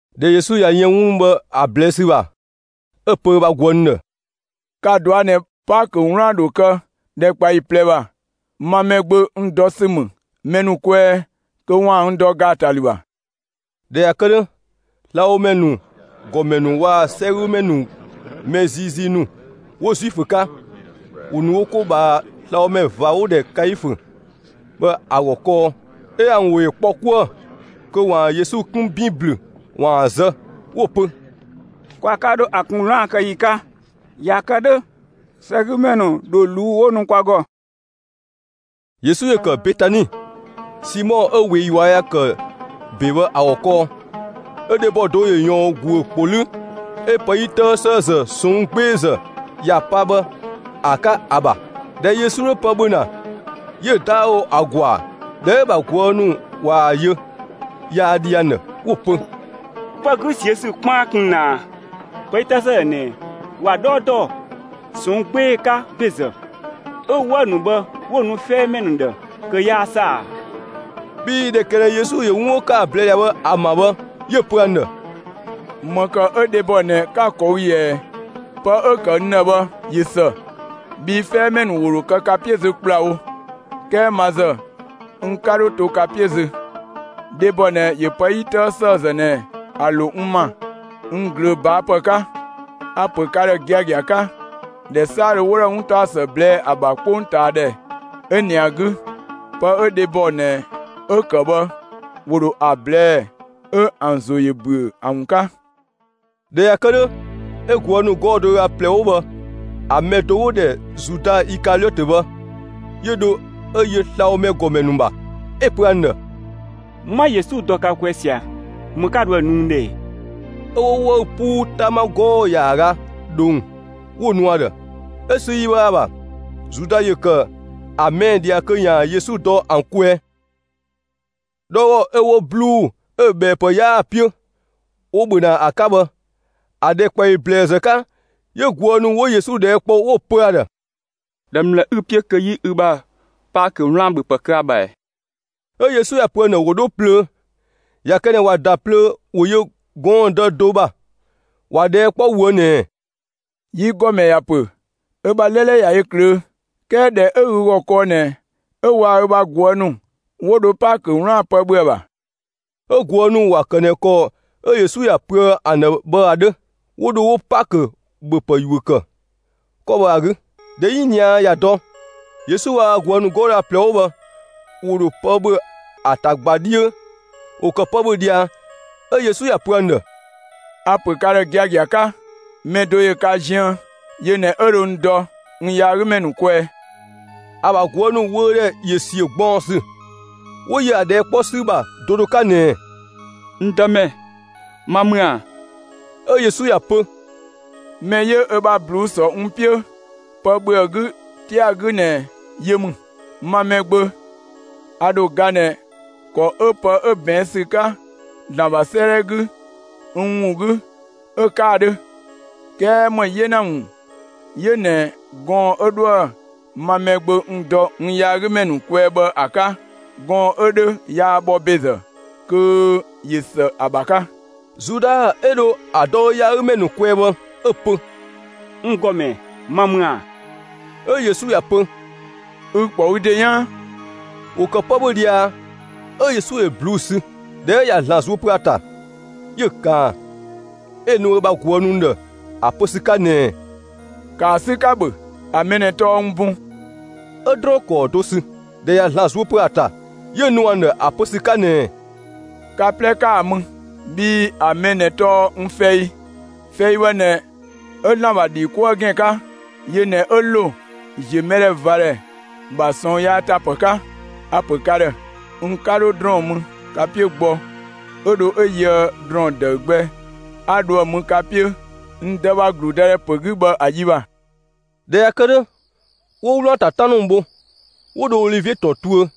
꞊Dhɛ Yesu ꞊ya yën 'wun ‑nu bhë ‑an ꞊blɛɛ' ‑sü ‑bha, 'ö‑ pö ö bha ꞊guë' ‑nu ‑dhë: «Ka‑ ꞊dɔa' ꞊nɛ, Paakö 'wlaan‑ ‑dho kë ‑dhɛkpaɔyi ꞊plɛ ‑bha, ma Mɛgbö, n dɔ ‑sü ‑mü mɛ ‑nu kwɛɛ kö ‑waan n dɔ ‑gaatalü ‑bha.» ꞊Dhɛ ꞊ya kë 'dhö, slabhomɛ ‑nu ‑gɔmɛ ‑nu waa‑ 'sɛgümɛ ‑nu mɛ ziizii ‑nu 'wo Zuifö 'ka, ‑wo ‑nu wo 'ko ꞊bhaa slabhomɛ ꞊va 'wo‑ ‑dhɛ Kaifö bhë ‑a ‑gɔ kɔɔ. 'Ö ‑an ‑wo ‑yö kpɔ 'kuë‑, kö ‑waan Yesu 'kun ‑bin ‑blü 'waan‑ zë; 'wo‑ pö: «Kwa 'ka 'dho ‑a kun 'wlaan‑ kë ‑yi 'ka. ꞊Ya kë 'dhö, 'sɛgümɛ ‑nu ‑dho ꞊luu' 'wo nu kwa ‑gɔ.» Yesu ‑yö ‑kë Betani, Simɔ 'ö ꞊wee ꞊yua' ‑ya ‑kë ‑be bhë ‑a ‑gɔ kɔɔ. 'Ö dhebɔ do ‑yö ꞊yɔɔn ‑guö ‑kpo 'lü 'ö pë 'yi 'tëë ‑sëëzë ꞊sɔnng' 'gbeezë ‑ya pa bhë ‑a 'ka ‑a ‑bha. ꞊Dhɛ Yesu 'dhö pë ‑bhö ‑na, 'yö‑ 'daawo ‑a ‑gɔa. ꞊Dhɛ 'ö‑ ‑bha ꞊guë' ‑nu ꞊waa‑ yö, yaa dhi ‑an ‑dhë, 'wo‑ pö: «Pë 'gü ꞊siö' ‑sü 'kpaan kun ꞊nɛ ꞊a? Pë 'yi 'tëë ‑sëëzë ꞊nɛ ‑wa 'dhɔɔ dɔ ꞊sɔnng' 'gbee‑ 'ka ‑bezë, 'ö‑ 'wëü‑ ‑nu bhë 'wo‑ nu 'fɛɛmɛ ‑nu ‑dhë kö 'yaa ‑së ‑a!» Bhii ꞊dhɛ ‑kë ꞊nɛ Yesu ‑yö 'wun 'wo ‑kë ‑a ꞊blɛɛ' ꞊dhia bhë ‑a ‑ma bhë, 'yö‑ pö ‑an ‑dhë: «‑Më ‑kë 'ö dhebɔ ꞊nɛ 'ka‑ ꞊kɔɔ' ꞊yɛɛ ꞊ɛ? Pë 'ö‑ ‑kë n ‑dhë bhë ꞊yö ‑së. Bhii 'fɛɛmɛ ‑nu ‑wo ‑dho kë ka 'piö zö ‑kplawo, 'kɛɛ ma ‑zë n 'ka 'dho to ka 'piö zö. Dhebɔ ꞊nɛ ‑yö pë 'yi 'tëë ‑sëëzë ꞊nɛ ‑a ‑lo n ‑ma n ꞊glöö ꞊baa' ‑pë 'ka. A‑ ‑pö ka ‑dhë giagia 'ka: ‑Dhɛ 'saadhö 'wo 'dhoë‑ 'wuntaɔsë ꞊blɛɛ' ‑a ‑bha 'kpongtaadhɛ 'ö ꞊nɛ ‑a 'gü, pë 'ö dhebɔ ꞊nɛ 'ö‑ ‑kë bhë ‑wo ‑dho ‑a ꞊blɛɛ'‑, 'ö ‑an ‑zo ‑yö ‑büö ‑a ‑wun 'ka.» ꞊Dhɛ ꞊ya kë 'dhö, 'ö ꞊guë' ‑nu 'gɔɔ‑ do ö ga ꞊plɛ 'wo bhë ‑a mɛ do 'wo‑ ‑dhɛ Zuda Ikaliɔtö bhë, 'yö dho 'ö yö slabhomɛ ‑gɔmɛ ‑nu ‑bha, 'ö‑ pö ‑an ‑dhë: «'Ma Yesu dɔ ka kwɛɛ ꞊sia, ‑më 'ka dhoë‑ nu n ‑dhë ‑ɛ?» 'Ö 'wo 'wëü‑ 'puu 'tama 'gɔɔ‑ ‑yaaga ꞊dhong, 'wo‑ nu ‑a ‑dhë. 'Ö sü yi bhë ‑a ‑bha, Zuda ‑yö ‑kë ‑a ꞊mɛɛ' ꞊dhia kö 'yaan‑ Yesu dɔ ‑an kwɛɛ. 'Dhɔɔgɔ 'ö 'wo 'bluu‑ 'ö‑ ꞊bhɛɛpë 'yaa‑ 'piö, 'wo‑ ‑bhö ‑na ‑a 'ka bhë, ‑a ‑dhɛkpaɔyi ‑blɛɛzë 'ka, 'yö ꞊guë' ‑nu 'wo Yesu ꞊dhɛɛ' ‑kpɔ, 'wo‑ pö ‑a ‑dhë: «‑Dhɛ ‑mlë 'ü‑ 'piö kö 'yi ü bha Paakö 'wlaan‑ ‑bhöpë kë ‑a ‑bha ‑ɛ?» 'Ö Yesu ‑ya pö ‑an ‑dhë ‑wo 'dho plöö; ꞊ya kë ꞊nɛ ꞊wa ‑da plöö ‑wo yö gɔɔndë do ‑bha; ‑wa ꞊dhɛɛ' kpɔ ꞊woë' ꞊nɛɛ: «Yi ‑gɔmɛ ‑ya ‑pö ö ‑bha 'lɛlɛ ꞊ya yö ꞊klöö'; 'kɛɛ ‑dhɛ 'ö ü ‑gɔ kɔɔ ꞊nɛ 'ö waa‑ ö ‑bha ꞊guë' ‑nu 'wo dho Paakö 'wlaan‑ ‑pë ‑bhö ‑a ‑bha.» 'Ö ꞊guë' ‑nu ‑wa ‑kë ꞊nɛ ‑kɔ 'ö Yesu ‑ya pöë ‑an ‑dhë bhë ‑a 'dhö. 'Wo dho 'wo Paakö ‑bhöpë ‑yuö ‑kë 'kɔ bhë ‑a 'gü. ꞊Dhɛ 'yiniadhɛ ꞊ya dɔ, Yesu waa‑ ö bha ꞊guë' ‑nu 'gɔɔ‑ do ö ga ꞊plɛ 'wo bhë ‑wo ‑dho pë ‑bhö ‑a ‑ta ꞊gba 'dhiö. ‑Wo ‑kë pë ‑bhö ꞊dhia, 'ö Yesu ‑ya pö ‑an ‑dhë: «A‑ ‑pö ka ‑dhë giagia 'ka: Mɛ do ‑yö ka ziën, yö ꞊nɛ 'ö dho n dɔ n yaagümɛ ‑nu kwɛɛ.» ‑A ‑bha ꞊guë' ‑nu wöödhɛ ‑yö ‑siö ꞊gbaɔnsü, 'wo yö ‑a ꞊dhɛɛ' 'kpɔ ‑sü ‑bha do do 'ka ꞊nɛɛ: «N Dëmɛ, ma ‑mü ‑a?» 'Ö Yesu ‑ya pö: «Mɛ 'yö ö bha ꞊bluu'‑ ‑sɔ n 'piö pë ‑bhö ‑a 'gü 'tia‑ 'gü ꞊nɛ yö ‑mü. Ma Mɛgbö, a ‑dho ga ꞊nɛ ‑kɔ 'ö pë 'ö ꞊bɛɛn' ‑sü 'ka ‑Zlan ‑bha 'sëëdhɛ 'gü n ‑wun 'gü 'ö‑ 'ka‑ 'dhö. 'Kɛɛ ‑më 'yena ‑wun 'yö ꞊nɛ gɔɔn‑ 'ö 'dhoë‑ ma Mɛgbö n dɔ n yaagümɛ ‑nu kwɛɛ bhë ‑a ‑bha 'ka! Gɔɔn‑ 'ö 'dhö yaa bhɔ ‑bezë, kö ꞊yö ‑së ‑a ‑bha 'ka!» Zuda 'ö dho ‑a dɔ ö yaagümɛ ‑nu kwɛɛ bhë, 'ö‑ pö: «N ‑Gɔmɛ, ma ‑mü ‑a?» 'Ö Yesu ‑ya pö: «Ü‑ ‑kpɔ ü ‑de 'yaan.» ‑Wo ‑kë pë ‑bhö ꞊dhia, 'ö Yesu ‑yö ꞊bluu'‑ ‑sü; ꞊dhɛ 'ö ꞊ya ‑Zlan zuö pö ‑a ‑ta, 'yö‑ ꞊kaan, 'ö‑ nu ö bha ꞊guë' ‑nu ‑dhë ‑a pö ‑sü 'ka ꞊nɛɛ: «‑Kaa 'sü, 'ka‑ ‑bhö, ‑a mɛ ꞊nɛ tɔɔ n bun.» 'Ö ‑drɔɔn ‑kɔɔ do sü; ꞊dhɛ ꞊ya ‑Zlan zuö pö ‑a ‑ta, 'yö‑ nu ‑an ‑dhë ‑a pö ‑sü 'ka ꞊nɛɛ: «Ka 'plɛ ‑kaa mü! Bhii ‑a mɛ ꞊nɛ tɔɔ n fɛi. Fɛi bhë ꞊nɛ 'ö ‑Zlan ‑bha ‑dhi 'kuë‑ gën 'ka. Yö ꞊nɛ 'ö ‑lo ‑ziö mɛdhɛvadhɛ ‑bha ꞊sɔɔn yaa ‑ta ‑pë 'ka. A‑ ‑pö ka ‑dhë: N 'ka ‑dho ‑drɔɔn mü ka 'piö gbɔ, 'ö dho 'ö yöë ‑drɔɔn ‑dëü gbɛ 'a dho ‑a mü ka 'piö n Dë ‑bha ‑gludëdhɛ ‑pö 'gü bhë ‑a yi ‑bha.» ꞊Dhɛ ꞊ya kë 'dhö, 'wo 'wlaan‑ ‑ta 'tan ‑nu bho, 'wo dho Olivie ‑tɔn tuö.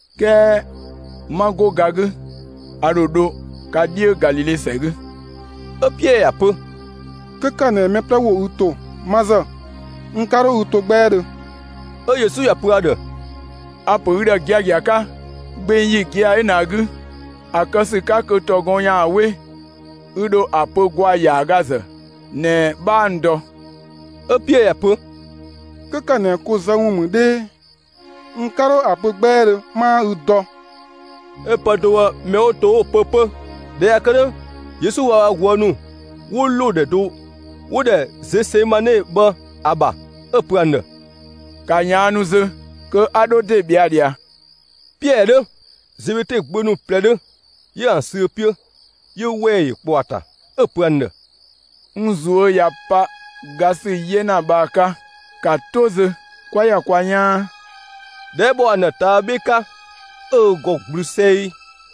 'Kɛɛ 'ma 'go ga 'gü, a ‑dho dho ka 'dhiö Galile ‑sɛ 'gü.» 'Ö Piɛɛ ‑ya pö: «'Kö ‑kë ꞊nɛ mɛ 'plɛ ‑wo ü ‑to, ma ‑zë, n 'ka 'dho ü to 'gbɛɛdhö.» 'Ö Yesu ‑ya pö ‑a ‑dhë: «A‑ ‑pö ü ‑dhë giagia 'ka: Gbeng ‑yi gia‑ 'ö ꞊nɛ ‑a 'gü, ‑a kë ‑sü 'ka kö ‑tɔ gɔn ‑yaan 'we, ü ‑dho ‑a pö ‑gwaa ‑yaaga ‑zë ꞊nɛ 'bhaa n dɔ.» 'Ö Piɛɛ ‑ya pö: «'Kö ‑kë ꞊nɛ ko zë ‑wun ‑mü 'dhee, n 'ka 'dho ‑a pö 'gbɛɛdhö 'maa ü dɔ!» 'Ö pë do bhë mɛ 'wo to 'wo‑ pö 'pö. ꞊Dhɛ ꞊ya kë 'dhö, Yesu waa‑ ö bha ꞊guë' ‑nu 'wo ‑lo ‑dhɛ do 'wo‑ ‑dhɛ Zesemane bhë ‑a ‑bha, 'ö‑ pö ‑an ‑dhë: «‑Ka ꞊yaannu zö, kö 'a 'dho ‑de ꞊bhɛa' ꞊dhia!» Piɛɛ 'dhö, Zebede gbö ‑nu ꞊plɛ 'dhö, 'yö ‑an sü ö 'piö. 'Yö ‑wɛɛ ‑yö ‑kpɔ ‑a ‑ta. 'Ö‑ pö ‑an ‑dhë: «N ꞊zuö' ꞊ya pa ga ‑sü 'yena bhë ‑a 'ka. ‑Ka 'to zö, 'kwa ‑ya kwa 'yaan!» ꞊Dhɛ 'ö bhɔ ‑an ‑dhë ꞊taa' 'bhe 'ka, 'ö ö ‑gɔ ‑gblü 'sɛi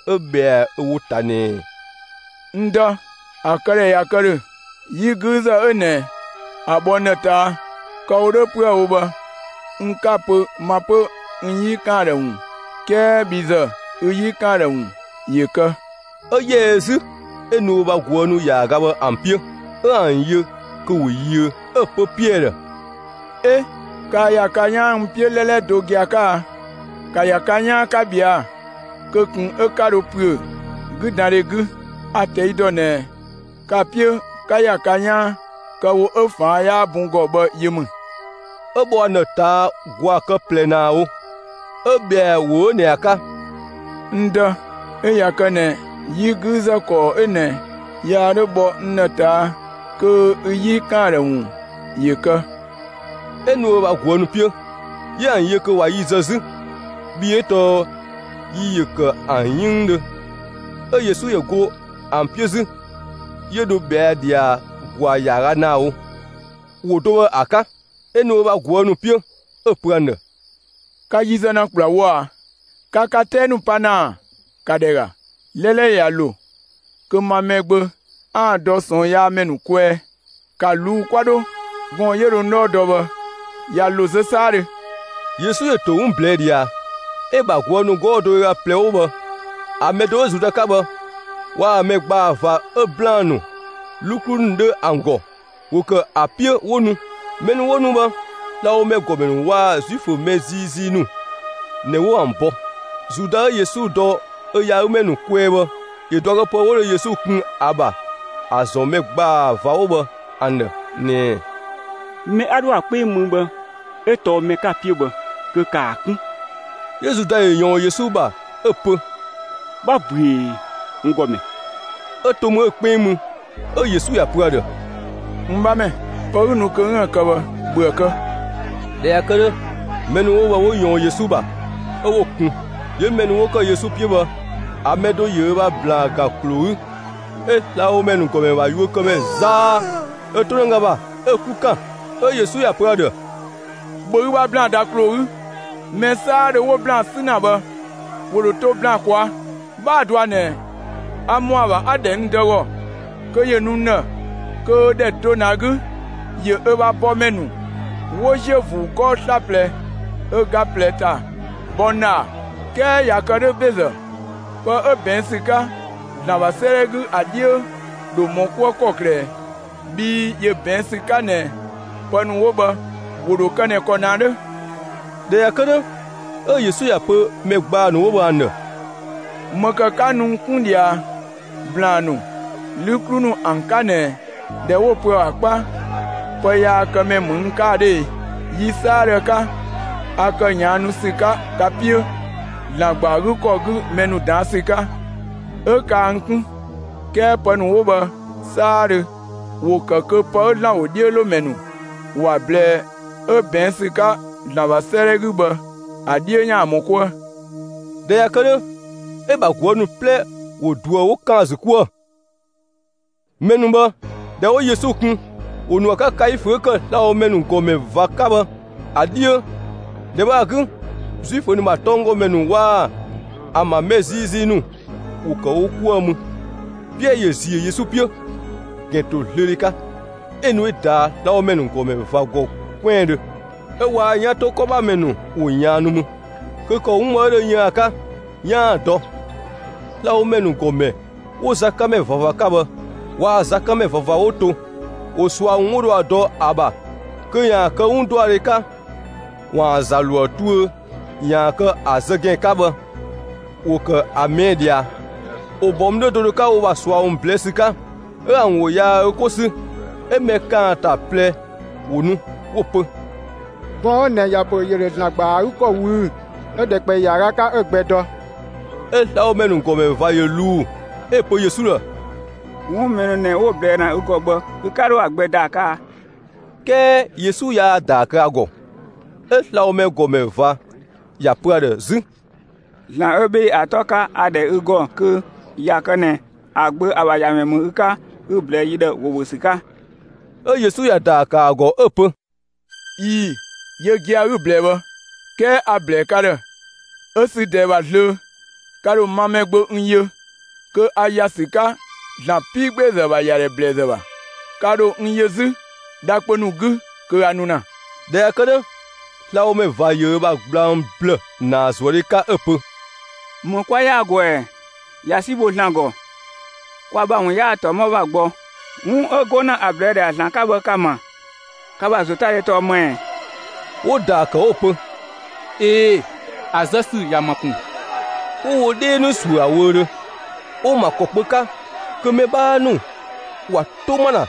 'ö ꞊bhɛa ö ‑wo ‑ta ꞊nɛɛ: «N Dë, ‑a këdhɛ ꞊ya kë ‑dhö, 'yi 'güüzë 'ö ꞊nɛ, ‑a bhɔ n ‑dhë ꞊taa'! Kë‑ wo 'dhö 'püë‑ wo bhë n 'ka‑ pö, ma 'pö n 'yi ꞊kaan ‑dhë ‑wun, 'kɛɛ bhi ‑zë, ü 'yi ꞊kaan ‑dhë ‑wun ‑yö kë.» 'Ö ‑yɛ ö 'zü 'ö nu ö bha ꞊guë' ‑nu ‑yaaga bhë ‑an 'piö, 'ö ‑an yö kö ‑wo yiö, 'ö‑ pö Piɛɛ ‑dhë: «'E! Kaa ‑ya ka 'yaan n 'piö 'lɛlɛ do gia‑ 'ka a? ‑Ka ‑ya ka 'yaan, 'ka ꞊bhɛa'‑, kö ꞊kun 'ö 'ka dho ‑püö 'güdandhe 'gü, a‑ ꞊tɛi' ‑dɔ ꞊nɛ ka‑ 'piö 'ka ‑ya ka 'yaan, kë‑ wo 'ö ꞊faan' 'yaa bun ‑gɔ bhë yö ‑mü.» 'Ö bhɔ ‑an ‑dhë ꞊taa' ‑gwaa kë ꞊plɛ ‑naa wo, 'ö ꞊bhɛa ‑wo 'ö ꞊nɛ ‑a 'ka: «N Dë, 'ö ꞊ya kë ꞊nɛ 'yi 'güüzë ‑kɔɔ 'ö ꞊nɛ yaa 'dho bhɔ n ‑dhë ꞊taa', kö ü 'yi ꞊kaan ‑dhë ‑wun ‑yö kë!» 'Ö nu ö bha ꞊guë' ‑nu 'piö, 'yö ‑an yö kö ꞊wa yi zë 'zü, bhii 'ö tɔɔ yi ‑yö ‑kë ‑an 'yënngdhö. 'Ö Yesu ‑yö go ‑an 'piö 'zü, 'yö dho ꞊bhɛa' ꞊dhia ‑gwaa ‑yaaga ‑naa wo, ‑wo do bhë ‑a 'ka. 'Ö nu ö bha ꞊guë' ‑nu 'piö, 'ö‑ pö ‑an ‑dhë: «Ka yi zë ‑na ‑kplawo ꞊a? Ka ka 'tɛɛ ‑nu pa ‑na ‑a? ‑Ka ‑dhɛ ‑ga: 'Lɛlɛ ꞊ya ‑lo kö ma Mɛgbö 'aan‑ dɔ ꞊sɔɔnyaamɛ ‑nu kwɛɛ. ‑Ka ꞊luu'‑ 'kwa 'dho! Gɔɔn‑ 'yö dho n 'dhɔɔ dɔ bhë, ꞊ya ‑lo zö 'saadhö!» Yesu ‑yö ‑to 'wun ꞊blɛɛ' ꞊dhia, 'ö‑ ‑bha ꞊guë' ‑nu 'gɔɔ‑ do ö ga ꞊plɛ 'wo bhë ‑a mɛ do 'ö Zuda 'ka bhë, waa‑ mɛ ‑gbaa ꞊va 'ö ‑blaan ‑nu, 'lü 'klu ‑nu 'dhö ‑an ‑gɔ, ‑wo ‑kë ‑a 'piö 'wo nu. Mɛ ‑nu 'wo nu bhë, slabhomɛ ‑gɔmɛ ‑nu waa‑ Zuifö mɛ ziizii ‑nu ꞊nɛ 'wo ‑an bɔ. Zuda 'ö Yesu dɔ ö yaagümɛ ‑nu kwɛɛ bhë, ‑yö ꞊duakëpë 'wo dho Yesu kun ‑a ‑bha ‑a ‑zɔn mɛ ‑gbaa ꞊va bhë ‑an ‑dhë ꞊nɛɛ: «Mɛ 'a 'dhoë‑ ‑a 'kpeng mü bhë 'ö tɔɔ mɛ 'ka‑ 'piö bhë kö ‑kaa 'kun!» 'Yö Zuda ‑yö ꞊yɔɔn Yesu ‑bha 'ö‑ pö: «'Bha ꞊büee, n ‑Gɔmɛ!» 'Ö to mü 'ö‑ 'kpeng mü. 'Ö Yesu ‑ya pö ‑a ‑dhë: «N 'bhamɛ, pë 'ü nu kö 'üën‑ ‑a kë bhë, ‑bhö ‑a kë!» ꞊Dhɛ ꞊ya kë 'dhö, mɛ ‑nu 'wo bhë 'wo ꞊yɔɔn Yesu ‑bha, 'ö 'wo‑ kun. 'Yö mɛ ‑nu 'wo ‑kë Yesu 'piö bhë ‑a mɛ do ‑yö ö ‑bha ‑blaan ‑gan ‑kloo 'gü, 'ö slabhomɛ ‑nu ‑gɔmɛ ‑bha yuökëmɛ zaa ö 'tonëga ‑bha, 'ö‑ 'klu ‑kan. 'Ö Yesu ‑ya pö ‑a ‑dhë: «‑Bhö ü bha ‑blaan ‑da ‑kloo 'gü, mɛ 'saadhö 'wo ‑blaan 'sü ‑na bhë, ‑wo ‑dho to ‑blaan ꞊kwaa'. 'Bhaa‑ dɔa ꞊nɛ a ‑mɔ ‑a ‑bha 'a‑ ‑dhɛ n Dë ‑gɔ kö ‑yö nu n ‑dhë, kö ‑dhɛ do ꞊nɛ ‑a 'gü 'yö ö bha bɔmɛ ‑nu 'wo ‑ziö ‑vuu 'gɔɔ‑ 'slaplɛ ö ga ꞊plɛ ‑ta bɔ n ‑dhë ‑a? 'Kɛɛ ꞊ya kë 'dhö ‑bezë, pë 'ö ꞊bɛɛn' ‑sü 'ka ‑Zlan ‑bha 'sëëdhɛ 'gü ‑a 'dhiö ‑dho ‑mɔ 'kuë ‑kɔklë ꞊ɛ? Bhii ‑yö ꞊bɛɛn' ‑sü 'ka ꞊nɛ pë ‑nu 'wo bhë ‑wo ‑dho kë ꞊nɛ ‑kɔ ꞊nɛ ‑a 'dhö.» ꞊Dhɛ ꞊ya kë 'dhö, 'ö Yesu ‑ya pö mɛ ‑gbaa ‑nu 'wo bhë ‑an ‑dhë: «‑Më ‑kë 'ka nu n 'kun ꞊dhia ‑blaan ‑nu, 'lü 'klu ‑nu ‑an 'ka ꞊nɛ ꞊dhɛ 'wo‑ pö ‑a ‑bha 'kpa pëyaakëmɛ ‑mü n 'ka ‑a 'dhö e? Yi 'saadhö 'ka, a ‑kë ꞊yaannu ‑sü 'ka ka 'piö ‑Zlan ‑gba ‑a 'gü ‑kɔ 'gü mɛ ‑nu ꞊daan' ‑sü 'ka, 'ö kaa n 'kun. 'Kɛɛ pë ‑nu 'wo bhë 'saadhö, ‑wo ‑kë kö pë 'ö ‑Zlan ‑wodhiölomɛ ‑nu ‑wa ꞊blɛɛ 'ö ꞊bɛɛn' ‑sü 'ka ‑Zlan ‑bha 'sëëdhɛ 'gü bhë, ‑a 'dhiö ‑yaan ‑mɔ 'kuë.» ꞊Dhɛ ꞊ya kë 'dhö, 'ö‑ ‑bha ꞊guë' ‑nu 'plɛ ‑wo ꞊duë 'wo ‑kan ‑a ‑zü 'kuë‑. Mɛ ‑nu bhë ꞊dhɛ 'wo Yesu kun, ‑wo ‑nu ‑a 'ka Kaifö 'ö ‑kë slabhomɛ ‑nu ‑gɔmɛ ꞊va 'ka bhë ‑a 'dhiö. ‑Dhɛ bhë ‑a 'gü, Zuifö ‑nu ‑bha tɔnggɔmɛ ‑nu waa‑ ‑an ‑bha mɛ ziizii ‑nu ‑wo ‑kë wo 'kuë‑ mü. Piɛɛ ‑yö ‑ziö Yesu 'piö, ‑gɛntozlöödhe 'ka, 'ö nu 'ö ꞊daa' slabhomɛ ‑nu ‑gɔmɛ ꞊va ‑gɔ 'kwɛandhö, 'ö waa‑ 'yan ‑to 'kɔ ‑bha ‑mɛ ‑nu ‑wo ꞊yaannu mü, kö ‑kɔ 'ö 'wun bhë 'ö dho yën ‑a 'ka, 'yaan‑ ‑a dɔ. Slabhomɛ ‑nu ‑gɔmɛ 'wo zakanmɛ ꞊vava 'ka bhë waa‑ zakanmɛ ꞊vava 'wo to, ‑wo ꞊sua ‑wun 'wo dho ‑a dɔ ‑a ‑bha kö ‑yaan kë 'wun ‑dɔadhe 'ka ‑waan ‑za ‑lo ‑a tuö ‑yaan kë ‑a zë ‑gɛn 'ka bhë, ‑wo ‑kë ‑a ꞊mɛɛ' ꞊dhia. ‑Wo ‑bɔ mü 'dhö do do 'ka wo ‑bha ꞊sua ‑wun ꞊blɛɛ' ‑sü 'ka, 'ö ‑an ‑wo yaa 'ö 'ko 'sü. 'Ö mɛ ‑kaanta ꞊plɛ ‑wo nu 'wo‑ pö: «Gɔɔn‑ 'ö ꞊nɛ ‑ya pö ‑yö ‑dho ‑Zlan ‑gba ‑a 'gü ‑kɔ ꞊wüü'‑, 'ö‑ ‑dhɛkpaɔyi ‑yaaga 'ka 'ö‑ gbɛ dɔ.» 'Ö slabhomɛ ‑nu ‑gɔmɛ ꞊va 'yö ꞊luu, 'ö‑ pö Yesu ‑dhë: «'Wun 'ö mɛ ‑nu ꞊nɛ 'wo‑ ꞊blɛɛ' ‑na ü ‑gɔ bhë, ü 'ka 'dho ‑a gbɛ ‑daa kë ꞊a?» 'Kɛɛ Yesu yaa ‑daa kë ‑a ‑gɔ. 'Ö slabhomɛ ‑gɔmɛ ꞊va ‑ya pö ‑a ‑dhë 'zü: «‑Zlan 'ö 'bhee‑ ‑a 'tɔ 'ka, a‑ ‑dhɛ ü ‑gɔ kö 'ö ꞊ya kë ꞊nɛ ‑a Gbö, ‑a ‑bha ‑Yamɛ ‑mü ü 'ka 'ü‑ ꞊blɛɛ'‑ yi ‑dhë ‑wo ‑bhö ‑sü 'ka!» 'Ö Yesu ‑ya ‑daa ‑kë ‑a ‑gɔ 'ö‑ pö: «꞊Ii‑, yö gia‑ 'ü‑ ꞊blɛɛ bhë, 'kɛɛ a‑ ‑blɛɛ ka ‑dhë: 'Ö sü ꞊dɛɛ ‑bha zlöö, ka ‑dho ma Mɛgbö n yö kö 'a ‑ya ‑sü 'ka ‑Zlan 'piigbeezë ‑bha ‑yadhɛ ꞊bhlëzë ‑bha. Ka ‑dho n yö 'zü dha kpö ‑nu 'gü kö a nu ‑na.» ꞊Dhɛ ꞊ya kë 'dhö, slabhomɛ ꞊va ‑yö ö ‑bha gblang ‑blë ‑naazuëdhe 'ka 'ö‑ pö: «‑Më 'kwa ‑yaa ‑gɔ ‑ɛ? ꞊Ya 'si bho ‑Zlan ‑gɔ! Kwa ‑bha ‑wun 'yaa ‑tɔmɔ ‑bha gbɔ, 'wun 'ö 'go ‑na ‑a ꞊blɛɛ' ꞊dhia ‑Zlan 'ka bhë, ka‑ ‑ma. Ka ‑bha ‑zotadhe tɔɔ ‑më ‑ɛ?» 'Wo‑ ‑daa ‑kë 'wo‑ pö: «꞊Ee‑, ‑a zë ‑sü ‑ya ‑ma ‑kun!» 'Wo wo 'dhee ‑nu ‑suö ‑a wöödhö, 'wo‑ ‑ma ‑kɔ kpö 'ka kö mɛ 'bhaa ‑nu ‑wa 'to ‑ma ‑na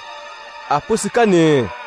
‑a pö ‑sü 'ka ꞊nɛɛ: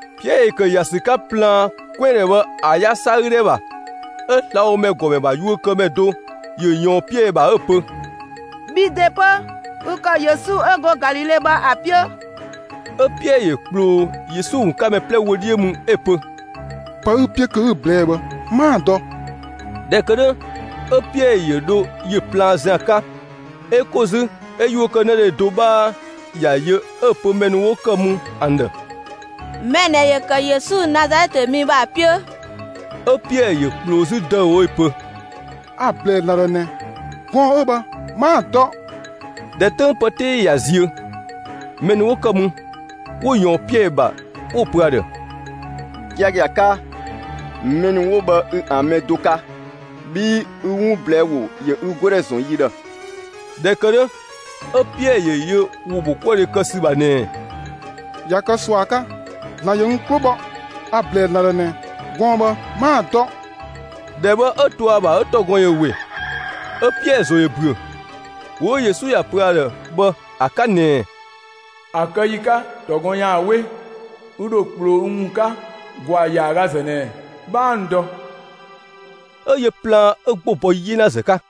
Piɛɛ ‑yö ‑kë ‑ya ‑sü 'ka plaan 'kwɛandhɛ bhë ‑a 'yasa 'gü ‑dhɛ ‑bha, 'ö slabhomɛ ‑gɔmɛ ‑bha yuökëdhe do ‑yö ꞊yɔɔn Piɛɛ ‑bha 'ö‑ pö: «Bhi ‑de 'pö, ü ‑kë Yesu 'ö go Galile bhë ‑a 'piö!» 'Ö Piɛɛ ‑yö ꞊kploo Yesu ‑wun 'ka mɛ 'plɛ wö 'dhiö mü 'ö‑ pö: «Pë 'ü‑ 'piö kö 'ü‑ ꞊blɛɛ'‑ bhë 'maa‑ dɔ!» ꞊Dhɛ ‑kë 'dhö 'ö Piɛɛ ‑yö dho ‑yö plaan ‑zian 'ka, 'ö ‑ko 'zü 'ö yuö kë 'në dhe do 'bhaa ‑ya yö 'ö‑ pö mɛ ‑nu 'wo kë mü ‑an ‑dhë: «Mɛ ꞊nɛ ‑yö ‑kë Yesu, Nazalɛtë mi bhë ‑a 'piö!» 'Ö Piɛɛ ‑yö ꞊kploo 'zü ‑dëüwo 'ö‑ pö: «A‑ ‑blɛɛ ‑Zlan ‑dhë ꞊nɛ, gɔɔn‑ 'ö bhë 'maa‑ dɔ!» ꞊Dhɛ 'töng pë 'tee ꞊ya ziö, mɛ ‑nu 'wo ‑kë mü, 'wo ꞊yɔɔn Piɛɛ ‑bha, 'wo‑ pö ‑a ‑dhë: «Giagia 'ka, mɛ ‑nu 'wo bhë ü ‑an mɛ do 'ka, bhii ü 'wun ꞊blɛɛ' ‑wo ‑yö ü 'godhɛ ‑zɔn yi ‑dhë.» ꞊Dhɛ ‑kë 'dhö, 'ö Piɛɛ ‑yö yö ‑wo ‑bhokuëdhe kë ‑sü ‑bha ꞊nɛɛ: «꞊Ya kë ꞊sua 'ka, ‑Zlan ‑yö n 'klo bhɔ! A‑ ‑blɛɛ ‑Zlan ‑dhë ꞊nɛ, gɔɔn‑ bhë 'maa‑ dɔ!» ‑Dhɛ bhë 'ö to ‑a ‑bha 'ö ‑tɔgɔn ‑yö ‑we. 'Ö Piɛɛ ‑zo ‑yö ‑büö, ‑wo 'ö Yesu ‑ya pö ‑a ‑dhë bhë ‑a 'ka ꞊nɛɛ: «‑A kë ‑yi 'ka, ‑tɔgɔn ‑yaan 'we, ü ‑dho ꞊kploo n ‑wun 'ka ‑gwaa ‑yaagazë ꞊nɛ, 'bhaa n dɔ.» 'Ö yö plaan 'ö 'gbo bɔ 'yenazë 'ka.